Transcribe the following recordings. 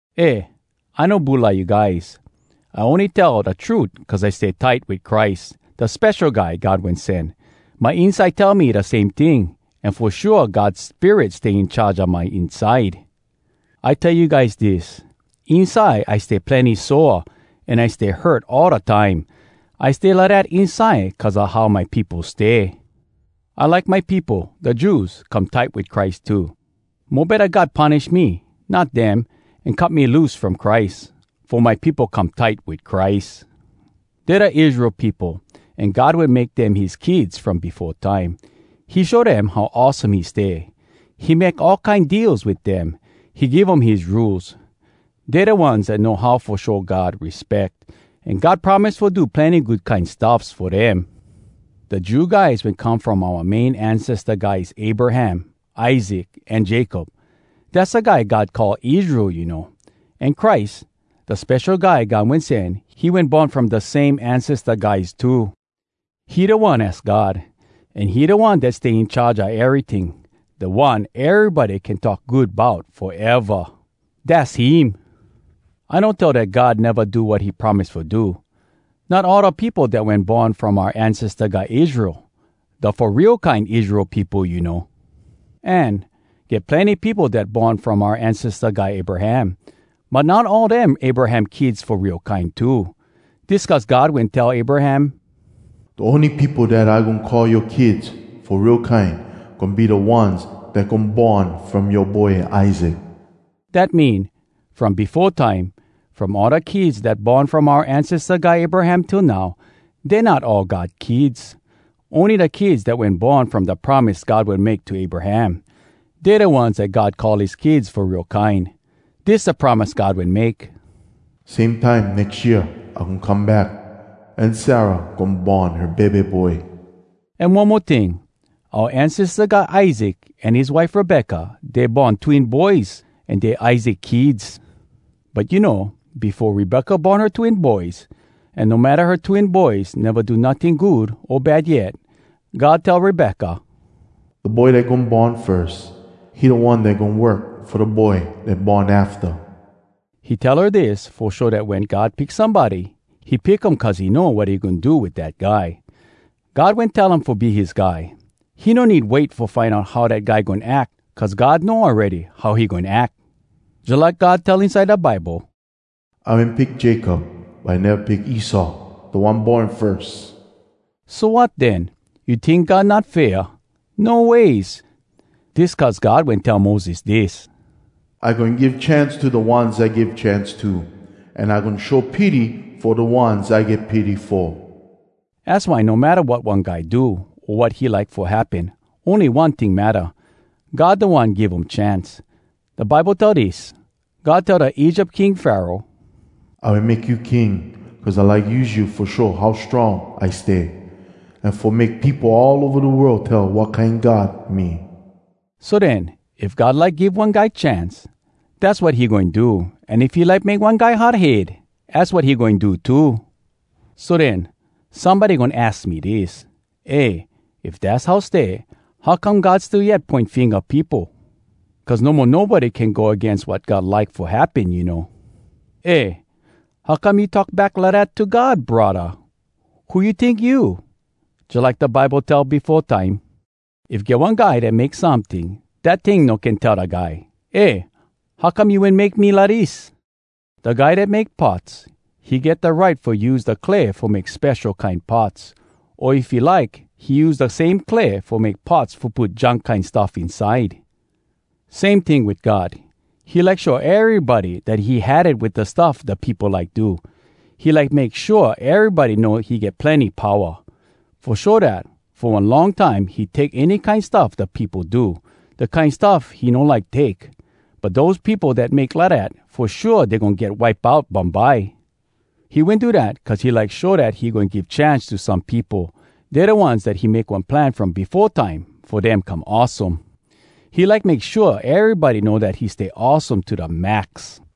Eh, I no bulai you guys, I ony tell da trut cuz I stay tight wit Christ, da Spesho Guy God Wen Sen. My inside tell me da same ting, an fo shua God Spirit stay in charge a my inside. I tell you guys dis: Inside I stay plenny sore an I stay hurt all da time. I stay lidat inside cuz a how my peopo stay. I like my peopo, da Jews, come tight wit Christ too. Mo betta God punish me, not dem, an cut me loose from Christ, fo my peopo come tight wit Christ. Dey da Israel peopo an God wen make dem his kids from befo time. He show dem how awesome he stay. He make all kine deals wit dem. He give um his Rules. Dey da ones dat know how fo show God respeck. An God promise fo do plenny good kine stuffs fo dem. Da Jew guys wen come from oua main ancesta guys Abraham, Isaac, an Jacob (dass da guy God call Israel, you know). An Christ, da Spesho Guy God Wen Sen, he wen born from da same ancesta guys too. He da One az God, an he da One dat stay in charge a eryting, da One erybody can talk good bout foeva! Dass him! I no tell dat God neva do wat he promise fo do. Not all da peopo dat wen born from oua ancesta guy Israel, da fo real kine Israel peopo, you know. An, get plenny peopo dat born from oua ancesta guy Abraham, but not all dem Abraham kids fo real kine too. Dis cuz God wen tell Abraham, “Da ony peopo dat I goin call yoa kids fo real kine goin be da ones dat goin born from yoa boy Isaac.” Dat mean, from befo time, from all da kids dat born from oua ancesta guy Abraham till now, dey not all God kids. Ony da kids dat wen born from da promise God wen make to Abraham, dey da ones dat God call his kids fo real kine. Dis da promise God wen make: “Same time nex year I goin come back, an Sarah goin born her bebe boy.” An one mo ting. Oua ancesta guy Isaac an his wife Rebecca, dey born twin boys an dey Isaac kids. But you know, befo Rebecca born her twin boys, an no matta her twin boys neva do notting good o bad yet, God tell Rebecca, “Da boy dat goin born firs, he da one dat goin work fo da boy dat born afta.” He tell her dis fo show dat wen God pick somebody, he pick um cuz he know wat he goin do wit dat guy. God wen tell um fo be his guy. He no need wait fo find out how dat guy goin ack cuz God know awready how he goin ack. Jalike God tell inside da Bible, “I wen pick Jacob, but I neva pick Esau, da one born firs.” So wat den? You tink God not fair? No ways! Dis cuz God wen tell Moses dis: “I goin give chance to da ones I give chance to, An I goin show pity fo da ones I get pity fo.” Az why, no matta wat one guy do, o wat he like fo happen, ony one ting matta—God da One give um chance. Da Bible tell dis. God tell da Egypt King Pharaoh, “I wen make you King cuz I like use you fo show how strong I stay, an fo make peopo all ova da world tell wat kine God me!” So den, if God like give one guy chance, dass wat he goin do. An if he like make one guy hard head, az wat he goin do too. So den, somebody goin aks me dis: “Eh! If dass how stay, how come God still yet poin finga peopo? Cuz no mo nobody can go agains wat God like fo happen, you know.” Eh, how come you talk back lidat to God, braddah? Who you tink you? Jalike da Bible tell befo time: “If get one guy dat make someting, dat ting no can tell da guy, ‘Eh! How come you wen make me lidis?’” Da guy dat make pots, he get da right fo use da clay fo make spesho kine pots. O if he like, he use da same clay fo make pots fo put junk kine stuff inside. Same ting wit God. He like show erybody dat he had it wit da stuff da peopo like do. He like make shua erybody know he get plenny powa. Fo show dat, fo one long time he take any kine stuff da peopo do—da kine stuff he no like take. But dose peopo dat make lidat, fo shua dey goin get wipe out bumbye. He wen do dat cuz he like show dat he goin give chance to some peopo. Dey da ones dat he make one plan from befo time fo dem come awesome. He like make shua erybody know dat he stay awesome to da max.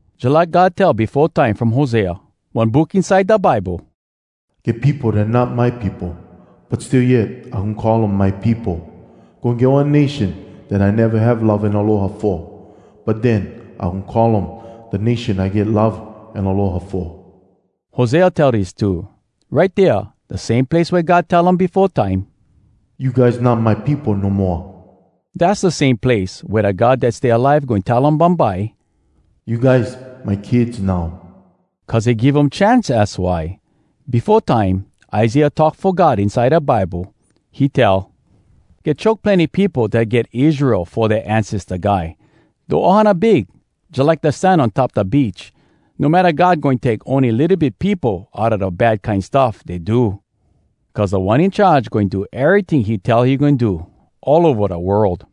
Jalike God tell befo time from Hosea, one book inside da Bible, “Get peopo dat not my peopo, But still yet I goin call um ‘my peopo.’ Goin get one nation dat I neva have love an aloha fo, But den, I goin call um ‘da nation I get love an aloha fo.’” Hosea tell dis too: “Right dea, Da same place wea God tell um befo time, ‘You guys not my peopo no moa!’ Dass da same place wea da God dat stay alive goin tell um bumbye, ‘You guys, my kids now!’” Cuz he give um chance, az why. Befo time, Isaiah talk fo God inside da Bible. He tell, “Get choke plenny peopo dat get Israel fo dea ancesta guy. Da ohana big, jalike da sand on top da beach, No matta God goin take ony litto bit peopo Outa da bad kine stuff dey do. Cuz Da One In Charge goin do eryting he tell he goin do, All ova da world.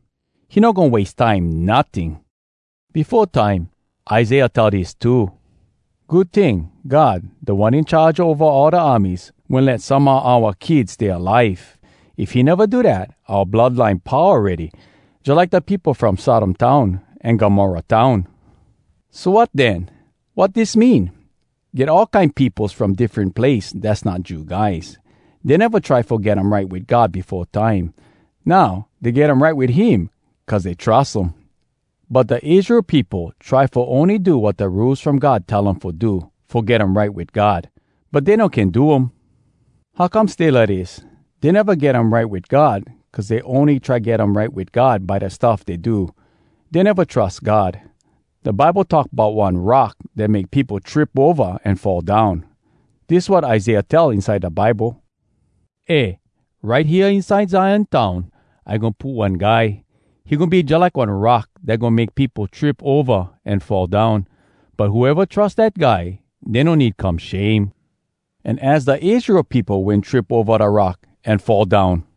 He no goin wase time notting!” Befo time, Isaiah tell dis too: “Good ting, God, Da One In Charge Ova All Da Armies, Wen let some a oua kids stay alive. If he neva do dat, oua blood line pau awready, Jalike da peopo from Sodom town an Gomorrah town.” So wat den? Wat dis mean? Get all kine peopos from diffren place dass not Jew guys. Dey neva try fo get um right wit God befo time. Now, dey get um right wit him cuz dey trus um. But da Israel peopo try fo ony do wat da Rules From God tell um fo do, fo get um right wit God, but dey no can do um. How come stay lidis? Dey neva get um right wit God cuz dey ony try get um right wit God by da stuff dey do. Dey neva trus God. Da Bible talk bout one “rock dat make peopo trip ova an fall down.” Dis wat Isaiah tell inside da Bible: “Eh! Right hea inside Zion Town, I goin put one Guy. He goin be jalike one rock Dat goin make peopo trip ova an fall down. But whoeva trus dat Guy, Dey no need come shame.” An az da Israel peopo wen trip ova dat rock an fall down!